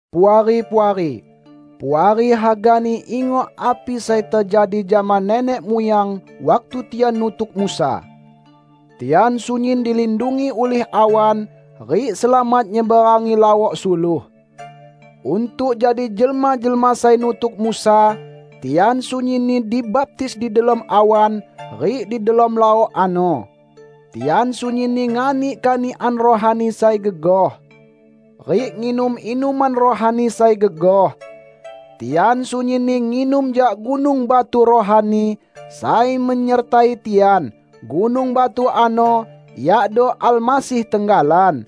Puari-puari! Puari hagani ingok api sai tejadi jama nenek muyang waktu tian nutuk Musa. Tian sunyin dilindungi ulih awan, rik selamat nyeberangi Laok Suluh. Untuk jadi jelma-jelma sai nutuk Musa, tian sunyinni dibaptis di delom awan rik di delom laok ano. Tian sunyinni nganik kanikan rohani sai gegoh rik nginum inuman rohani sai gegoh. Tian sunyinni nginum jak gunung batu rohani sai menyertai tian; gunung batu ano iado Almasih tenggalan.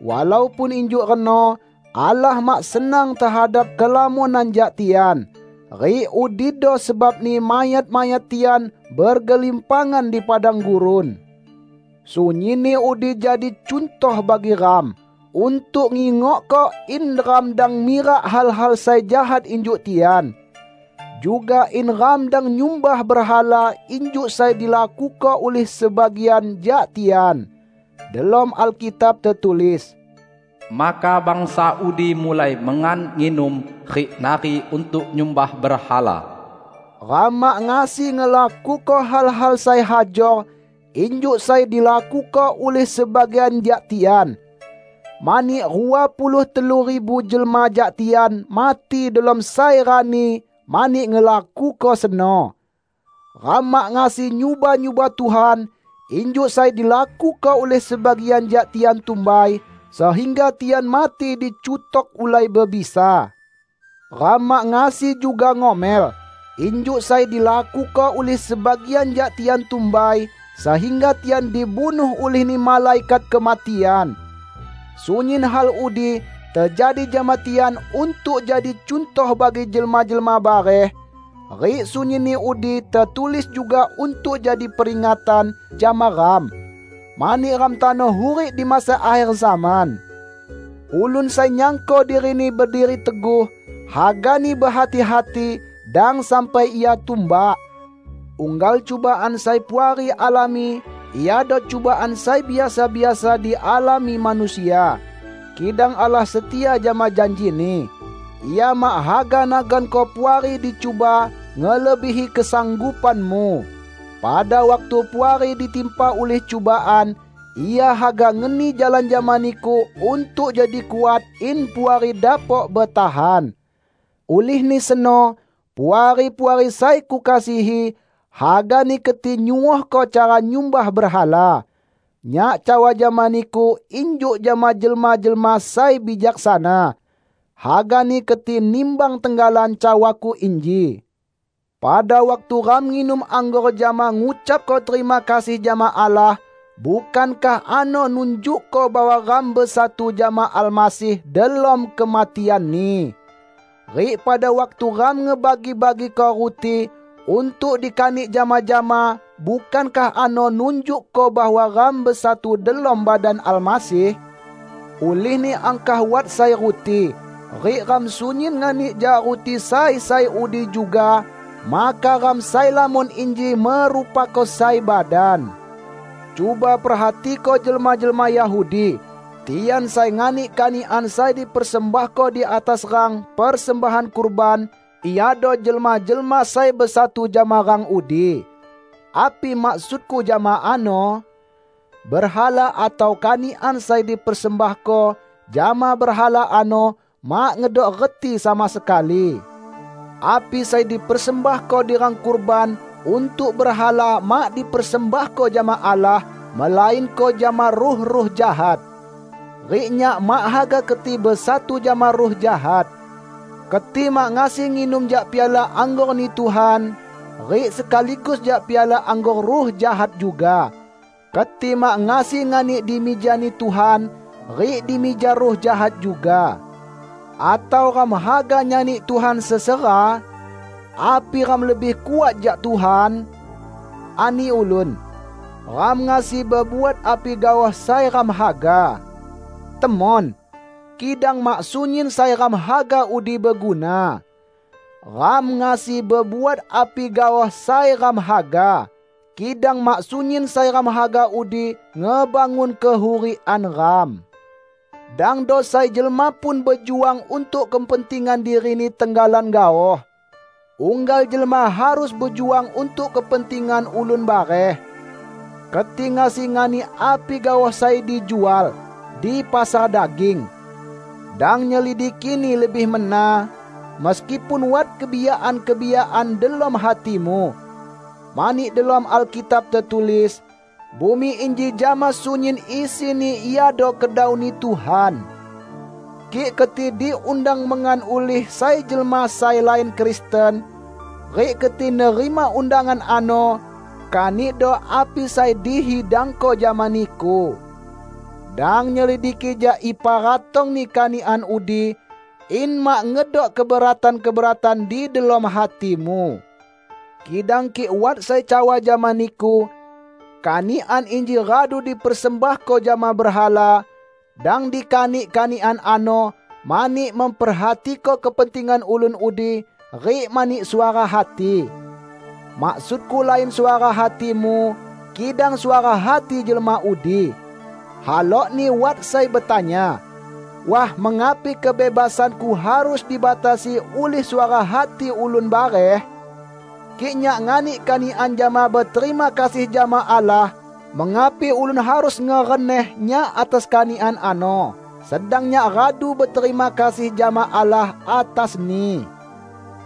Walaupun injuk reno, Allah mak senang tehadap kelamonan jak tian, rik udido sebabni mayat-mayat tian bergelimpangan di padang gurun. Sunyinni udi jadi cuntoh bagi ram, untuk ngingokko in ram dang mirak hal-hal sai jahat injuk tian. Juga in ram dang nyumbah berhala injuk sai dilakuko ulih sebagian jak tian. Delom Alkitab tetulis, "Maka bangsa udi mulai mengan nginum, rik nari untuk nyumbah berhala." Ram mak ngasi ngelakuko hal-hal sai hajor injuk sai dilakuko ulih sebagian jak tian. Mani, rua puluh telu ribu jelma jak tian mati delom sai rani mani ngelakuko seno. Ram mak ngasi nyuba-nyuba Tuhan injuk sai dilakuko ulih sebagian jak tian tumbai, sehingga tian mati dicutok ulai bebisa. Ram mak ngasi juga ngomel, injuk sai dilakuko ulih sebagian jak tian tumbai, sehingga tian dibunuh ulihni Malaikat Kematian. Sunyin hal udi tejadi jama tian untuk jadi cuntoh bagi jelma-jelma bareh. Rik sunyinni udi tetulis juga untuk jadi peringatan jama ram. Mani ram tano hurik di masa akher zaman. Ulun sai nyangko dirini berdiri teguh, hagani behati-hati; dang sampai ia tumbak. Unggal cubaan sai Puari alami iado cubaan sai biasa-biasa dialami manusia. Kidang Allah setia jama janji-Ni. Ia mak haga naganko Puari dicuba ngelebihi kesanggupanmu. Pada waktu Puari ditimpa ulih cubaan, Ia haga ngeni jalan jama niku untuk jadi kuat in Puari dapok betahan. Ulihni seno, Puari-puari sai kukasihi, hagani keti nyuohko cara nyumbah berhala. Nyak cawa jama niku injuk jama jelma-jelma sai bijaksana. Hagani keti nimbang tenggalan cawaku inji. Pada waktu ram nginum anggor jama ngucapko terima kasih jama Allah, bukankah ano nunjukko bahwa ram besatu jama Almasih delom kematian-Ni? Rik pada waktu ram ngebagi-bagiko ruti untuk dikanik jama-jama, bukankah ano nunjukko bahwa ram besatu delom badan Almasih? Ulihni angkah wat sai ruti, rik ram sunyin nganik jak ruti sai sai udi juga, maka ram sai lamon inji merupako sai badan. Cuba perhatiko jelma-jelma Yahudi. Tian sai nganik kanikan sai dipersembahko di atas rang persembahan kurban, iado jelma-jelma sai besatu jama rang udi. Api maksudku jama ano? Berhala atau kanikan sai dipersembahko jama berhala ano mak ngedok reti sama sekali. Api sai dipersembahko di rang kurban untuk berhala mak dipersembahko jama Allah, melainko jama ruh-ruh jahat. Rik nyak mak haga keti besatu jama ruh jahat. Keti mak ngasi nginum jak piala anggor-Ni Tuhan, rik sekaligus jak piala anggor ruh jahat juga. Keti mak ngasi nganik di mija-Ni Tuhan, rik di mija ruh jahat juga. Atau ram haga nyani Tuhan sesera? Api ram lebih kuat jak Tuhan? Ani ulun, "Ram ngasi bebuat api gaoh sai ram haga." Temon! Kidang mak sunyin sai ram haga udi beguna. "Ram ngasi bebuat api gaoh sai ram haga" -- kidang mak sunyin sai ram haga udi ngebangun kehurikan ram. Dangdo sai jelma pun bejuang untuk kepentingan dirini tenggalan gaoh. Unggal jelma harus bejuang untuk kepentingan ulun bareh. Keti ngasi nganik api gaoh sai dijual di pasar daging. Dang nyelidikini lebih mena, meskipun wat kebiyakan-kebiyakan delom hatimu. Mani delom Alkitab tetulis, "Bumi inji jama sunyin isini iado kedau-Ni Tuhan." Kik keti diundang mengan ulih sai jelma sai lain Kristen, rik keti nerima undangan ano, kanikdo api sai dihidangko jama niku. Dang nyelidiki jak ipa ratongni kanikan udi, in mak ngedok keberatan-keberatan di delom hatimu. Kidang kik wat sai cawa jama niku, "Kanikan inji radu dipersembahko jama berhala," dang dikanik kanikan ano, mani memperhatiko kepentingan ulun udi rik mani suara hati. Maksudku lain suara hatimu, kidang suara hati jelma udi. Halokni wat sai betanya, "Wah mengapi kebebasanku harus dibatasi ulih suara hati ulun bareh? Kik nyak nganik kanikan jama beterima kasih jama Allah, mengapi ulun harus ngereneh nyak atas kanikan ano, sedang nyak radu beterima kasih jama Allah atasni?"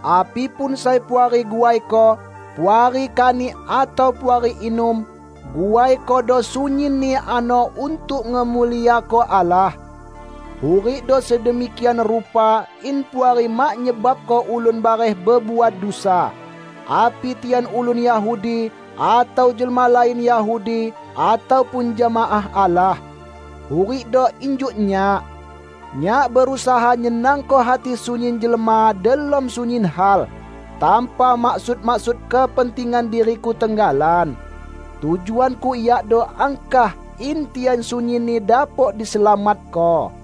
Api pun sai Puari guaiko -- Puari kanik atau Puari inum -- guaikodo sunyinni ano untuk ngemuliako Allah. Hurikdo sedemikian rupa in Puari mak nyebabko ulun bareh bebuat dusa; api tian ulun Yahudi, atau jelma lain Yahudi ataupun jemaah Allah. Hurikdo injuk nyak. Nyak berusaha nyenangko hati sunyin jelma delom sunyin hal, tanpa maksud-maksud kepentingan diriku tenggalan. Tujuanku yakdo angkah in tian sunyinni dapok diselamatko.